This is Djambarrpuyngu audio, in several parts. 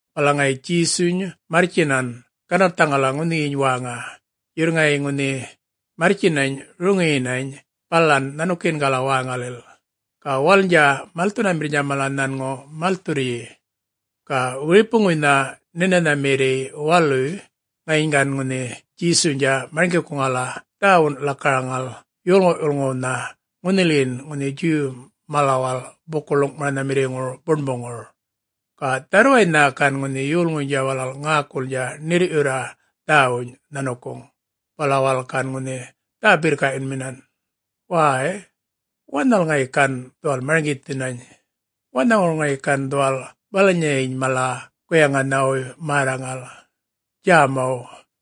Bala ŋayi Djesuny marrtjinan ganarrthaŋala ŋunhiyiny wäŋa, yurr ŋayi ŋunhi marrtjinany roŋiyinany balan nhanukiyingala wäŋalil, ga walalnydja malthunamirrnydja mala nhanŋu malthurryi. Ga wiripuŋuynha Nhinanhamirriy waluy, ŋayiny gan ŋunhi Djesuynydja marŋgikuŋala dhäwun lakaraŋal yolŋu'-yulŋuwnha ŋunhilin ŋunhi Djuw malawal buku-ḻuŋ'maranhamirriŋura buṉbuŋur. Ga dharrwaynha gan ŋunhi yolŋuynydja walal ŋäkulnydja ṉirr'yurra dhäwuny nhanukuŋ, bala walal gan ŋunhi dhä-birrka'yunminan, “Way, wanhal ŋayi gan dhuwal marŋgithinany? Wanhaŋur ŋayi gan dhuwal balanyayiny mala guyaŋanhawuy märraŋal, djämaw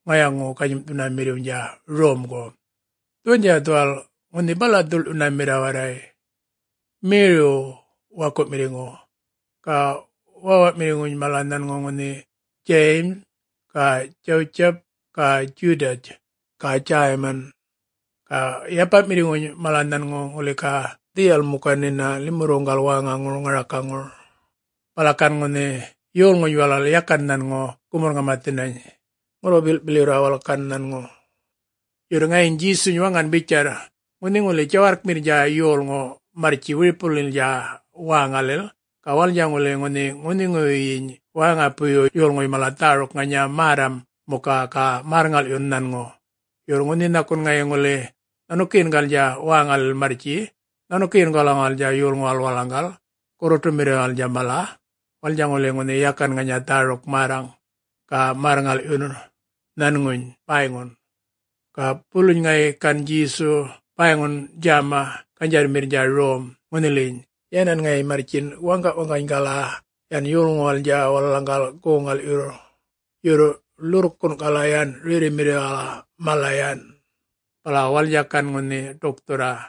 ŋayaŋu-ganyim'thunamirriwnydja romgu? Dhuwandja dhuwal ŋunhi bala'-dhuḻ'yunamirr warray, Meriw waku'mirriŋu. Ga wäwa'mirriŋuny mala nhanŋu ŋunhi Djayim ga Djawutjip ga Djudatj ga Djäyman, ga yapa'mirriŋuny mala nhanŋu ŋuli ga dhiyal muka nhina limurruŋgala wäŋaŋur ŋaraka.” Bala gan ŋunhi yolŋuny walal yakan nhanŋu gumurr-ŋamathinany ŋurru-bil'bilyurra walal gan nhanŋu. Yurr ŋayiny Djesuny waŋan bitjarr, “Ŋunhi ŋuli djawarrkmirrnydja yolŋu marrtji wiripuŋulilnydja wäŋalil, ga walalnydja ŋuli ŋunhi ŋunhiŋuwuyyiny wäŋapuyyu yolŋuy mala dhäruk ŋanya märram muka ga märr-ŋal'yun nhanŋu. Yurr ŋunhi nhakun ŋayi ŋuli nhanukiyingalnydja wäŋalil marrtji nhanukiyingalaŋuwalnydja yolŋuwal walalaŋgal gurruṯumirriwalnydja mala walalnydja ŋuli ŋunhi yakan ŋanya dhäruk-märraŋ ga märr-ŋal'yurr nhanŋuny bäyŋun.” Ga buluny ŋayi gan Djesuy bäyŋun djäma ganydjarrmirrnydja rom ŋunhiliyiny, yänan ŋayi marrtjin waŋga'-waŋganygala yan yolŋuwalnydja walalaŋgal goŋ-ŋal'yurr yurr ḻurrkun'kala yan rerrimirriwala mala yan, bala walalnydja gan yan ḏukthurra.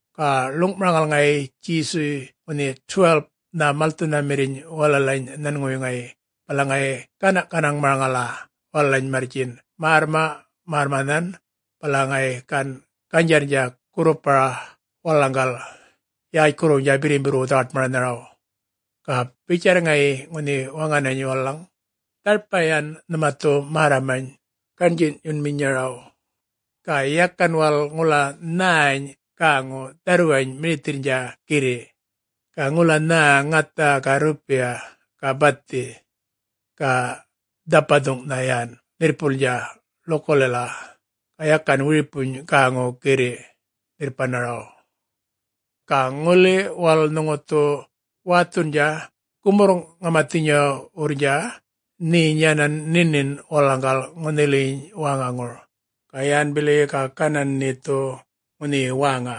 Ga ḻuŋ'maraŋal ŋayi Djesuy ŋunhi 12-nha malthunamirriny walalany nhanŋuwuy ŋayi, bala ŋayi gäna'-ganaŋ'maraŋala walalany marrtjin märrma'-marrmanhan. Bala ŋayi gan ganydjarrnydja gurrupara walalaŋgal yätjkurruwnydja birrimbirrwu dhawaṯmaranharaw. Ga bitjarr ŋayi ŋunhi waŋanany walalaŋgal, “Dharpa yan nhuma dhu märramany gaṉdji'yunminyaraw. Ga yakan walal ŋula nhäny gäŋu dharrwany mirithirrnydja girri', ga ŋula nhä ŋatha ga rrupiya, ga bathi. Ga dhapathuŋ'nha yan nhirrpulnydja ḻukulila, ga yakan wiripuny gäŋu girri' nhirrpanaraw. Ga ŋuli walal nhuŋu dhu wäthundja gumurr-ŋamathinyawurrnydja nheny yanan nhinin walalaŋgal ŋunhiliyiny wäŋaŋur, ga yan bili ga ganan nhe dhu ŋunhiyi wäŋa.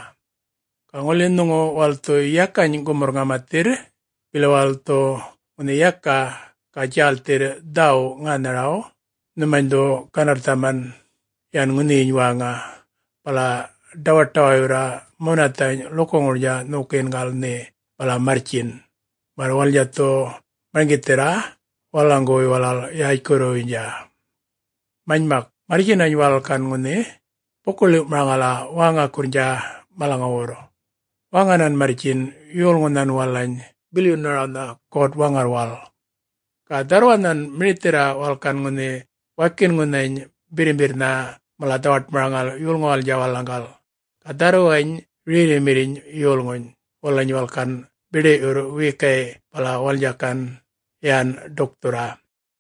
Ga ŋuli nhuŋu walal dhu yakany gumurr-ŋamathirr, bili walal dhu ŋunhi yaka ga djälthirr dhäwuw ŋänharaw, nhumany dhu ganarrthaman yan ŋunhiyiny wäŋa, bala ḏawaṯawayurra munathany' ḻukuŋurnydja nhokiyingal nhe bala marrtjin, märr walalnydja dhu marŋgithirra walalaŋguwuy walal yätjkurruwnydja.” Manymak, marrtjinany walal gan ŋunhi buku-ḻiw'maraŋala wäŋakurrnydja malaŋuwurr waŋanan marrtjin yolŋunhan walalany bilyunarawnha God-Waŋarrwal. Ga dharrwanhan mirithirra walal gan ŋunhi wakinŋunhany birrimbirrnha mala dhawaṯmaraŋal yolŋuwalnydja walalaŋgal. Ga dharrwany rerrimirriny yolŋuny walalany walal gan biḏi'yurr wiyikay', bala walalnydja gan yan ḏukthurra.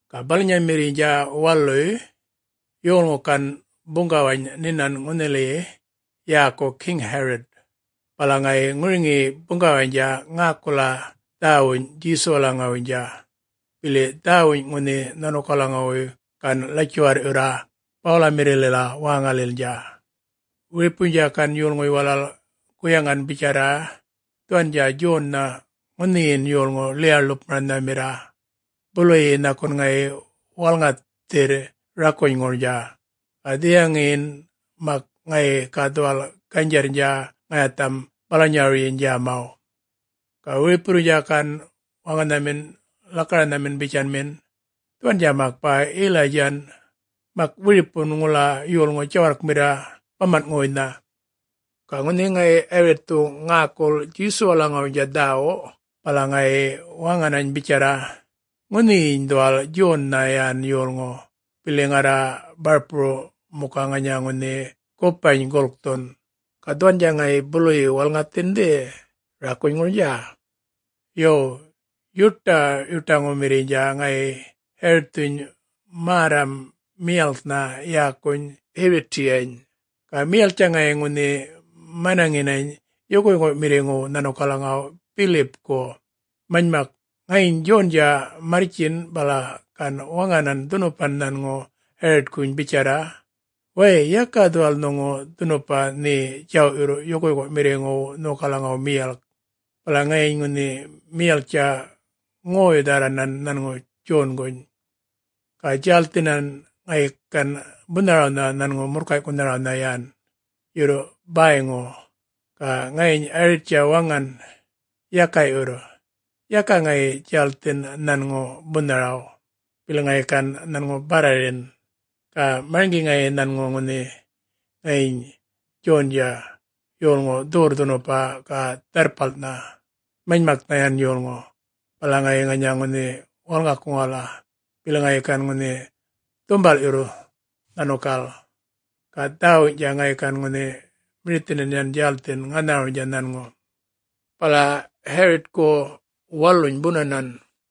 Ga balanyamirriynydja waluy yolŋu gan buŋgawany nhinan ŋunhiliyiny yäku Geŋ-Yarit. Bala ŋayi ŋuriŋiyi buŋgawaynydja ŋäkula dhäwuny Djesuwalaŋuwuynydja, bili dhäwuny ŋunhi nhanukalaŋuwuy gan ḻatjuwarr'yurra bawalamirrilila wäŋalilnydja. Wiripuynydja gan yolŋuy walal guyaŋan bitjarra, “Dhuwandja Djonnha ŋunhiyin yolŋu ḻiya-ḻupmaranhamirra, buluyi nhakun ŋayi walŋathirr rakunyŋurnydja, ga dhiyaŋiyin mak ŋayi ga dhuwal ganydjarrnydja ŋayatham balanyarawyiny djämaw.” Ga wiripuwurrnydja gan waŋanhamin lakaranhamin bitjanminan, “Dhuwandja mak bäy Yilaydjan. Mak wiripun ŋula yolŋu djawarrkmirr baman'ŋuwuynha.” Ga ŋunhi ŋayi Yaritthu ŋäkul Djesuwalaŋuwuynydja dhäwu, bala ŋayi waŋanany bitjarra, “Ŋunhiyiny dhuwal Djonnha yan yolŋu, bili ŋarra barpuru muka ŋanya ŋunhi gupany gulkthun ga dhuwandja ŋayi buluyi walŋathindhi rakunyŋurnydja.” Yo, yuṯa'-yuṯaŋumirriynydja ŋayi Yaritthuny märram miyalknha yäkuny Yirutiyany, ga miyalktja ŋayi ŋunhi manaŋinany yukuyuku'mirriŋuw nhanukalaŋuw Bilipku. Manymak, ŋayiny Djondja marrtjin bala gan waŋanan dhunupan nhanŋu Yaritkuny bitjarra, “Way yaka dhuwal nhuŋu dhunupa nhe djaw'yurr yukuyuku'mirriŋuw nhokalaŋaw miyalk.” Bala ŋayiny ŋunhi miyalktja ŋoy-dhärranan nhanŋu Djonguny, ga djälthinany ŋayi gan bunharawnha nhanŋu murrkay'kunharawnha yan, yurr bäyŋu. Ga ŋayiny Yarittja waŋan yaka'yurr, yaka ŋayi djälthin nhanŋu bunharaw, bili ŋayi gan nhanŋu barrarin, ga marŋgi ŋayi nhanŋu ŋunhi ŋayiny Djondja yolŋu dhuwurr-dhunupan ga dharrpalnha, manymaknha yan yolŋu. Bala ŋayi ŋanya ŋunhi walŋakuŋala, bili ŋayi gan ŋunhi dhumbal'yurra nhanukal, ga dhäwuwny'tja ŋayi gan ŋunhi mirithinan yan djälthinany ŋänharawnydja nhanŋu. Bala Yaritku waluny bunanan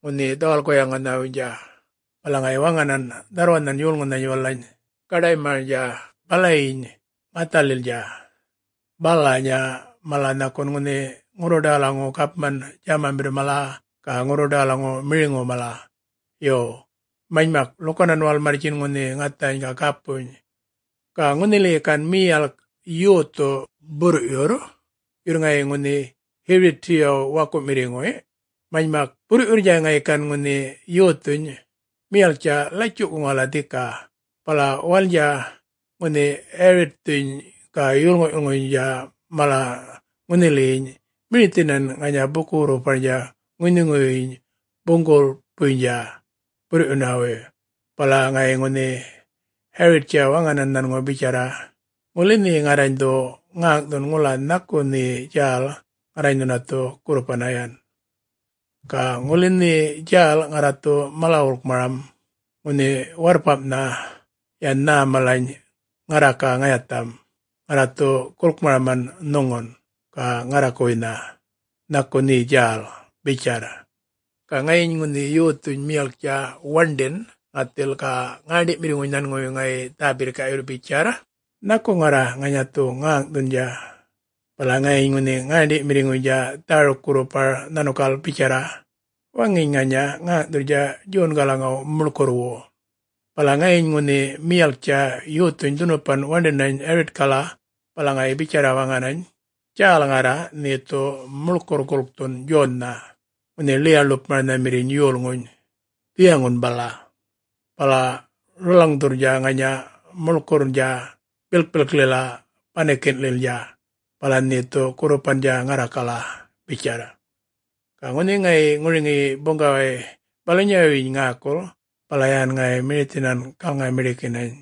ŋunhi dhawal-guyaŋanhawuynydja, bala ŋayi waŋanan dharrwanhan yolŋunhany walalany gaḏaymarnydja balayiny ŋathalilnydja, balanya mala nhakun ŋunhi ŋurruḏawalaŋu gapman djämamirr mala, ga ŋurruḏawalaŋu miriŋu mala. Yo, manymak ḻukanan walal marrtjin ŋunhi ŋathany ga gapuny, ga ŋunhiliyi gan miyalk yothu burr'yurr, yurr ŋayi ŋunhi Yirutiyaw waku'mirriŋuny. Manymak burr'yurrnydja ŋayi gan ŋunhi yothuny miyalktja latju'kuŋala dhika. Bala walalnydja ŋunhi Yaritthuny ga yolŋu'-yulŋuynydja mala ŋunhiliyiny mirithinan ŋanya buku-wurrparnydja ŋunhiŋuwuyyiny buŋgulpuynydja burr'yunawuy. Bala ŋayi ŋunhi Yarittja waŋanan nhanŋu bitjarra, “Ŋuli nhe ŋarrany dhu ŋäŋ'thun ŋula nhaku nhe djäl, ŋarrany nhuna dhu gurrupanna yan. Ga ŋuli nhe djälnydja ŋarra dhu mala-wulkmaraman ŋunhi warrpam'nha yan nhä malany ŋarra ga ŋayatham, … ŋarra dhu gulkmaraman nhuŋun, ga ŋarrakuwuynha. Nhaku nheny djäl?” bitjarr. Ga ŋayiny ŋunhi yothuny miyalktja waṉḏin ŋathil ga ŋäṉḏi'mirriŋuny nhanŋuwuy ŋayi dhä-birrka'yurr bitjarr, “Nhaku ŋarra ŋanya dhu ŋäŋ'thundja,” bitjarr. Bala ŋayiny ŋunhi ŋäṉḏi'mirriŋuynydja dhäruk gurrupar nhanukal bitjarra, “Waŋiny ŋanya ŋäŋ'thurrnydja Djongalaw muḻkurrwu.” Bala ŋayiny ŋunhi miyalktja yothuny dhunupan waṉḏinany Yaritkala, bala ŋayi bitjarra waŋanany, “Djälnydja ŋarra, nhe dhu muḻkurr gulkthun Djonnha ŋunhi ḻiya-ḻupmaranhamirriny yolŋuny dhiyaŋun bala, bala rulwaŋdhurrnydja ŋanya muḻkurrnydja bilkpilklila banikin'lilnydja, bala nhe dhu gurrupandja ŋarrakala,” bitjarr. Ga ŋunhi ŋayi ŋuriŋiyi buŋgaway balanyawuyyiny ŋäkul, bala yan ŋayi mirithinan galŋa-miḏikinany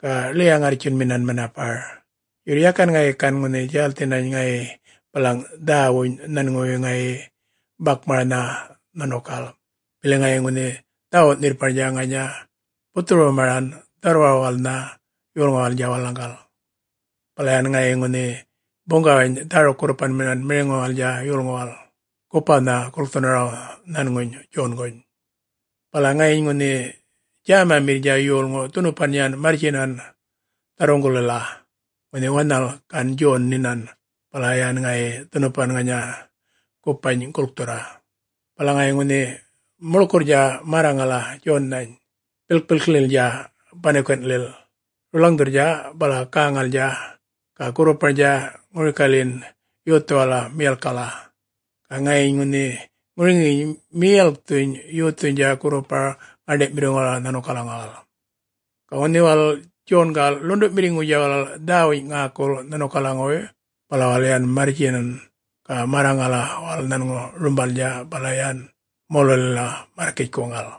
ga ḻiya-ŋarrtjunminan manapar. Yurr yakan ŋayi gan ŋunhi djälthinany ŋayi balaŋ dhawuny' nhanŋuwuy ŋayi bakmaranha nhanukal, bili ŋayi ŋunhi dhawu'-nhirrparnydja ŋanya buthurumaran dharrwawalnha yolŋuwalnydja walalaŋgal. Bala yan ŋayi ŋunhi buŋgawany dhäruk-gurrupanminan miriŋuwalal yolŋuwal gupawnha gulkthunaraw nhanŋuny Djonguny. Bala ŋayiny ŋunhi djämamirrnydja yolŋu dhunupan yan marrtjinany dharruŋgulila, ŋunhi wanhal gan Djon nhinan, bala yan ŋayi dhunupan ŋanya gupany gulkthurra. Bala ŋayi ŋunhi muḻkurrnydja märraŋala Djonnhany bilkpilklilnydja banikin' rulwaŋdhurr bala gäŋalnydja ga gurruparnydja ŋurikalyin yothuwala miyalkkala. Ga ŋayiny ŋunhi ŋuriŋiyiny miyalkthuny yothuynydja gurrupar ŋäṉḏi'mirriŋuwala nhanukalaŋuwal. Ga ŋunhi walal Djongal ḻundu'mirriŋuy walal dhäwuny ŋäkul nhanukalaŋuwuy, bala walal yan marrtjinan ga märraŋala walal nhanŋu rumbalnydja bala yan molulila märrkitjkuŋal.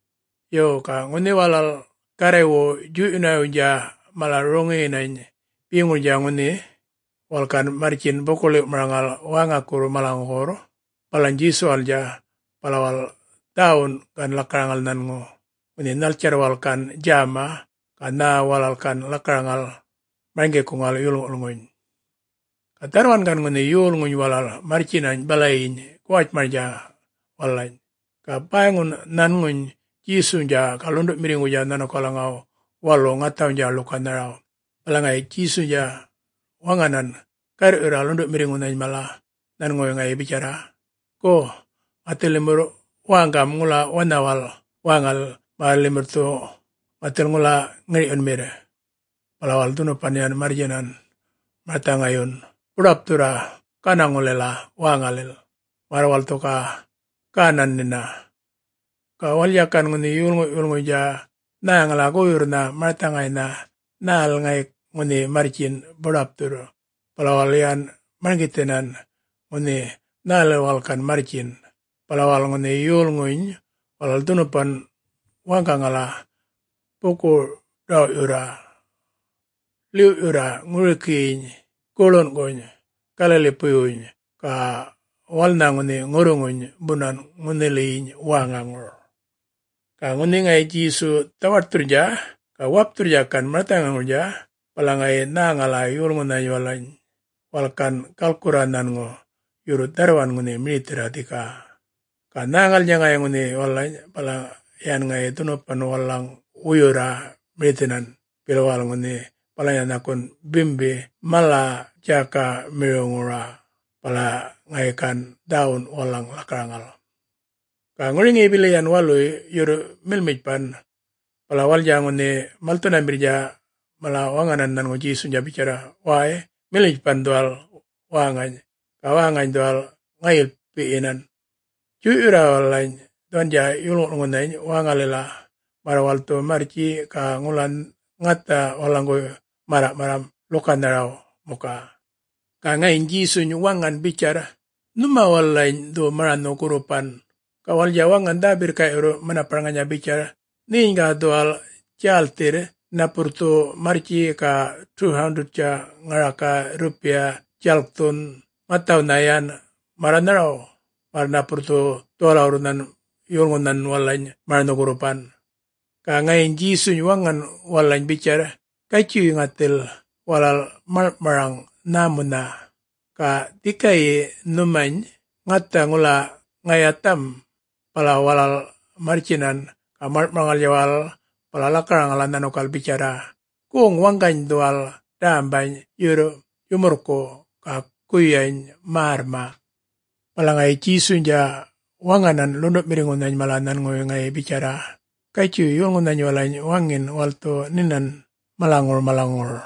Yo, ga ŋunhi walal Garraywu djuy'yunawuynydja mala roŋiyinany beŋurnydja ŋunhi walal gan marrtjin buku-ḻiw'maraŋal wäŋakurr malaŋuwurr, balany Djesuwalnydja, bala walal dhäwun gan lakaraŋal nhanŋu, ŋunhi nhaltjarr walal gan djäma ga nhä walal gan lakaraŋal marŋgikuŋal yolŋu'-yulŋuny. Ga dharrwan gan ŋunhi yolŋuny walal marrtjinany balayiny guwatjmarnydja walalany, ga bäyŋun nhanŋuny Djesuwnydja ga ḻundu'mirriŋuwnydja nhanukalaŋaw walu ŋathawnydja ḻukanharaw. Bala ŋayi Djesuynydja waŋanan garr'yurra ḻundu'mirriŋunhany mala nhanŋuwuy ŋayi bitjarra, “Go ŋathil limurr wäŋgam ŋula wanhawal wäŋalil, märr limurr dhu ŋathil ŋula ŋir'yunmirr.” Bala walal dhunupan yan marrtjinan marthaŋayyun buḏapthurra gänaŋulila wäŋalil märr walal dhu ga gäna nhina. Ga walalnydja gan ŋunhi yolŋu'-yulŋuynydja nhäŋala goyurrnha marthaŋaynhan nhälil ŋayi ŋunhi marrtjin buḏapthurr, bala walal yan marŋgithinan ŋunhi nhälil walal gan marrtjin. Bala walal ŋunhi yolŋuny walal dhunupan wäŋgaŋala buku-ḏaw'yurra, ḻiw'yurra ŋurikiyiny guḻunguny Galalipuywuny, ga walalnha ŋunhi ŋurruŋuny bunan ŋunhiliyiny wäŋaŋur. Ga ŋunhi ŋayi Djesu dhawaṯthurrnydja ga wapthurrnydja gan marthaŋayŋurnydja, bala ŋayi nhäŋala yolŋunhany walalany walal gan galkurra nhanŋu, yurr dharrwan ŋunhi mirithirra dhika. Ga nhäŋalnydja ŋayi ŋunhi walalany, bala yan ŋayi dhunupan walalaŋ warwuyurra mirithinan, bili walal ŋunhi balanya nhakun bimbi mala djäkamiriwŋur. Bala ŋayi gan dhäwun walalaŋ lakaraŋal. Ga ŋuriŋiyi bili yan waluy yurr milmitjpan, bala walalnydja ŋunhi malthunamirrnydja mala waŋanan nhanŋu Djesuwnydja bitjarra, “Way milmitjpan dhuwal wäŋany, ga wäŋany dhuwal ŋayilpi'yinan. Djuy'yurra walalany dhuwandja yolŋu'-yulŋunhany wäŋalila, märr walal dhu marrtji ga ŋula ŋatha walalaŋguwuy märra'-marram ḻukanharaw muka.” Ga ŋayiny Djesuny waŋan bitjarr, “Nhuma walalany dhu maranhu-gurrupan.” Ga walalnydja waŋan dhä-birrka'yurr manapar ŋanya bitjarr, “Nheny ga dhuwal djälthirr, napurr dhu marrtji ga 200-tja ŋaraka rrupiya djalkthun ŋathawnha yan märranharaw, märr napurr dhu dhuwalawurrunhan yolŋunhan walalany maranhu-gurrupan?” Ga ŋayiny Djesuynydja waŋan walalany bitjarr, “Gatjuy ŋathil walal maḻŋ'maraŋ nhämunha' ga dhikayi nhumany ŋatha ŋula ŋayatham.” Bala walal marrtjinan ga maḻŋ'maraŋalnydja walal bala lakaraŋala nhanukal bitjarra, “Goŋ-waŋgany dhuwal dämbany yurr yumurrku', ga guyany märrma'.” Bala ŋayi Djesuynydja waŋanan ḻundu'mirriŋunhany mala nhanŋuwuy ŋayi bitjarra, “Gatjuy yolŋunhany walalany waŋin walal dhu nhinan malaŋur malaŋur.”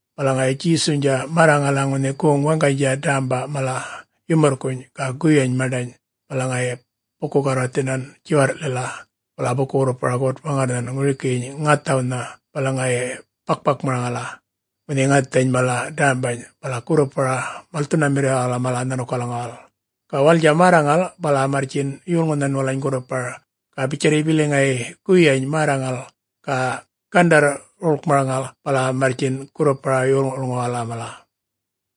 Bala ŋayi Djesuynydja märraŋala ŋunhi goŋ-waŋganydja dämba mala yumurrkuny ga guyany maṉḏany, bala ŋayi buku-garrwarthinan djiwarr'lila, bala buku-wurrpara God-Waŋarrnhan ŋurikiyin ŋathawnha. Bala ŋayi bak-bakmaraŋala ŋunhi ŋathany mala dämbany bala gurrupara malthunamirriwal mala nhanukalaŋuwal, ga walalnydja märraŋal bala marrtjin yolŋunhan walalany gurrupar. Ga bitjarryi bili ŋayi guyany märraŋal ga gandarr-wulkmaraŋal bala marrtjin gurrupara yolŋu'-yulŋuwala mala.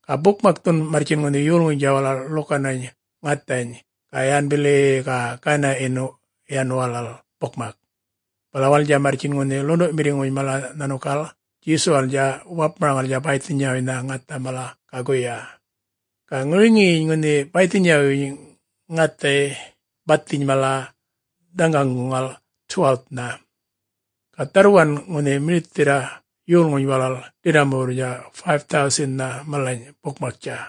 Ga bukmakthun marrtjin ŋunhi yolŋuynydja walal ḻukanany ŋathany, ga yan bili-i-i ga gana'yin yan walal bukmak. Bala walalnydja marrtjin ŋunhi ḻundu'mirriŋuynydja mala nhanukal Djesuwalnydja wapmaraŋala bäythinyawuynydja ŋatha mala ga guyany. Ga ŋuriŋiyiny ŋunhi bäythinyawuyyuny ŋathay bathiny mala dhaŋaŋguŋal 12-nha. Ga dharrwan ŋunhi mirithirra yolŋuny walal ḏirramuwurrnydja 5,000-nha malany bukmaktja.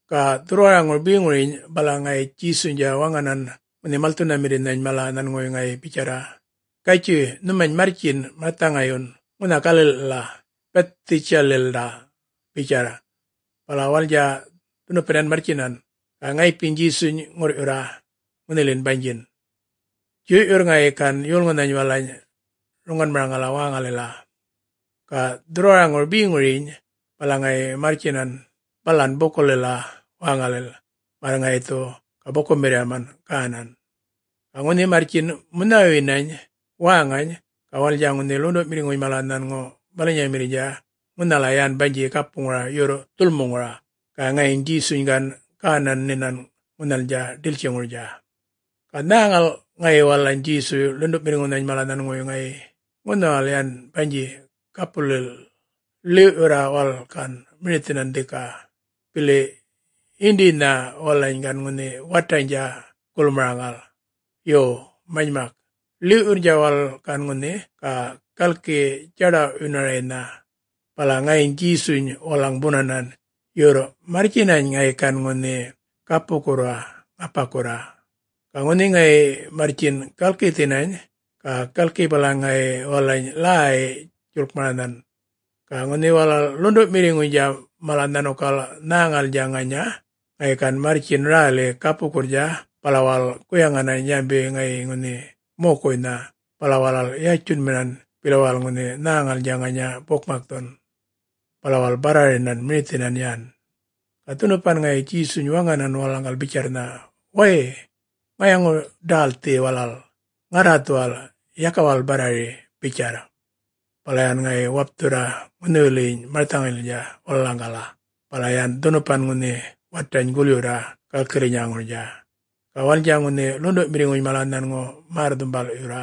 Ga dhurrwaraŋur beŋuryiny bala ŋayi Djesuynydja waŋanan ŋunhi malthunamirrinhany mala nhanŋuwuy ŋayi bitjarra, “Gatjuy nhumany marrtjin marthaŋayyun ŋunha gali'lila Bithdjaydalila,” bitjarr. Bala walalnydja dhunupan yan marrtjinan, ga ŋayipiny Djesuny ŋurr'yurra ŋunhiliyin banydjin, djuy'yurra ŋayi gan yolŋunhan walalany roŋanmaraŋala wäŋalila. Ga dhurrwaraŋur beŋuryiny, bala ŋayi marrtjinan balan bukumirrilila wäŋalila, märr ŋayi dhu ga bukumirriyam gänan. Ga ŋunhi marrtjin munhawuyinany wäŋany, ga walalnydja ŋunhi ḻundu'mirriŋuny mala nhanŋu balanyamirriy ŋunhal yan banydji gapuŋur yurr dhulmuŋura, ga ŋayiny Djesuny gan gänan nhinan ŋunhalnydja ḏiltjiŋurnydja. Ga nhäŋal ŋayi walalany Djesuy ḻundu'mirriŋunhany mala nhanŋuwuy ŋayi ŋunhawal yan banydji gapulil ḻiw'yurra walal gan mirithinan dhika, bili yindiynha walalany gan ŋunhi wataynydja gulmaraŋal. Yo manymak, ḻiw'yurrnydja walal gan ŋunhi ga galki djaḏaw'yunaraynha, bala ŋayiny Djesuny walalaŋ bunanan, yurr marrtjinany ŋayi gan ŋunhi gapukurra ŋapakurra. Ga ŋunhi ŋayi marrtjin galkithinany, ga galki balaŋ ŋayi walalany ḻäy-djuḻkmaranhan. Ga ŋunhi walal ḻundu'mirriŋuynydja mala nhanukal nhäŋalnydja ŋanya, ŋayi gan marrtjin räli gapukurrnydja, bala walal guyaŋanany yanbi ŋayi ŋunhi mokuynha, bala walal yatjunminan, bili walal ŋunhi nhäŋalnydja ŋanya bukmakthun, bala walal barrarinany mirithinan yan. Ga dhunupan ŋayi Djesuny waŋanan walalaŋgal bitjarrnha, “Way, ŋayaŋu-ḏälthi walal. Ŋarra dhuwal! Yaka walal barrari!” bitjarr. Bala yan ŋayi wapthurra ŋunhiwiliyin marthaŋaylila walalaŋgala, bala yan dhunupan ŋunhi watany gulyurra galkirrinyaŋurnydja. Ga walalnydja ŋunhi ḻundu'mirriŋuny mala nhanŋu märr-dhumbal'yurra.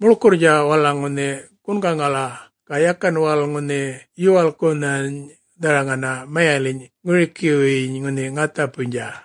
Muḻkurrnydja walalaŋ ŋunhi gungaŋala ga yakan walal ŋunhi yuwalkkunhany dharaŋana mayaliny' ŋurikiwuyyiny ŋunhi ŋathaypuynydja.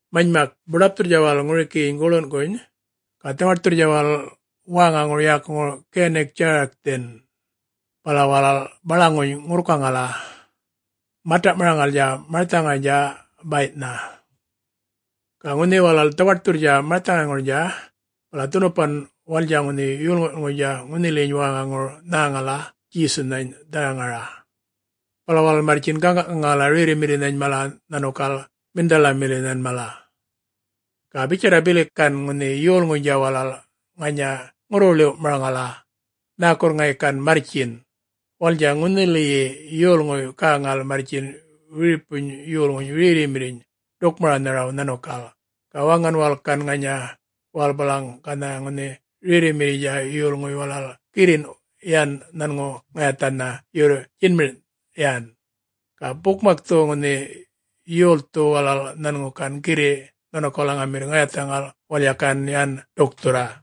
Manymak buḏapthurra walal ŋurikiyiny guḻunguny, ga dhawaṯthurrnydja walal wäŋaŋur yäkuŋur Ginitjarathan, bala walal baḻaŋuny ŋurrkaŋala, mata'maraŋalnydja marthaŋaynydja bay'nha. Ga ŋunhi walal dhawaṯthurrnydja marthaŋayŋurnydja, bala dhunupan walalnydja ŋunhi yolŋu'-yulŋuynydja ŋunhiliyiny wäŋaŋur nhäŋala Djesunhany dharaŋara, bala walal marrtjin gäŋa'-gaŋala rerrimirrinhan mala nhanukal miṉdhalamirrinhan mala. Ga bitjarra bili gan ŋunhi yolŋuynydja walal ŋanya ŋurru-ḻiw'-ḻiwmaraŋala, nhäkurr ŋayi gan marrtjin, walalnydja ŋunhiliyi yolŋuny walal, gäŋal marrtjin wiripuny yolŋuny rerrimirriny ḏukmaranharaw nhanukal. Ga waŋan walal gan ŋanya walal balaŋ ganha ŋunhi rerrimirriynydja yolŋuy walal girrin yan nhanŋu ŋayathanha yurr djinmir' yan. Ga bukmakthu ŋunhi yolthu walal nhanŋu gan girri' nhanukalaŋumirr ŋayathaŋal walalnydja gan yan ḏukthurra.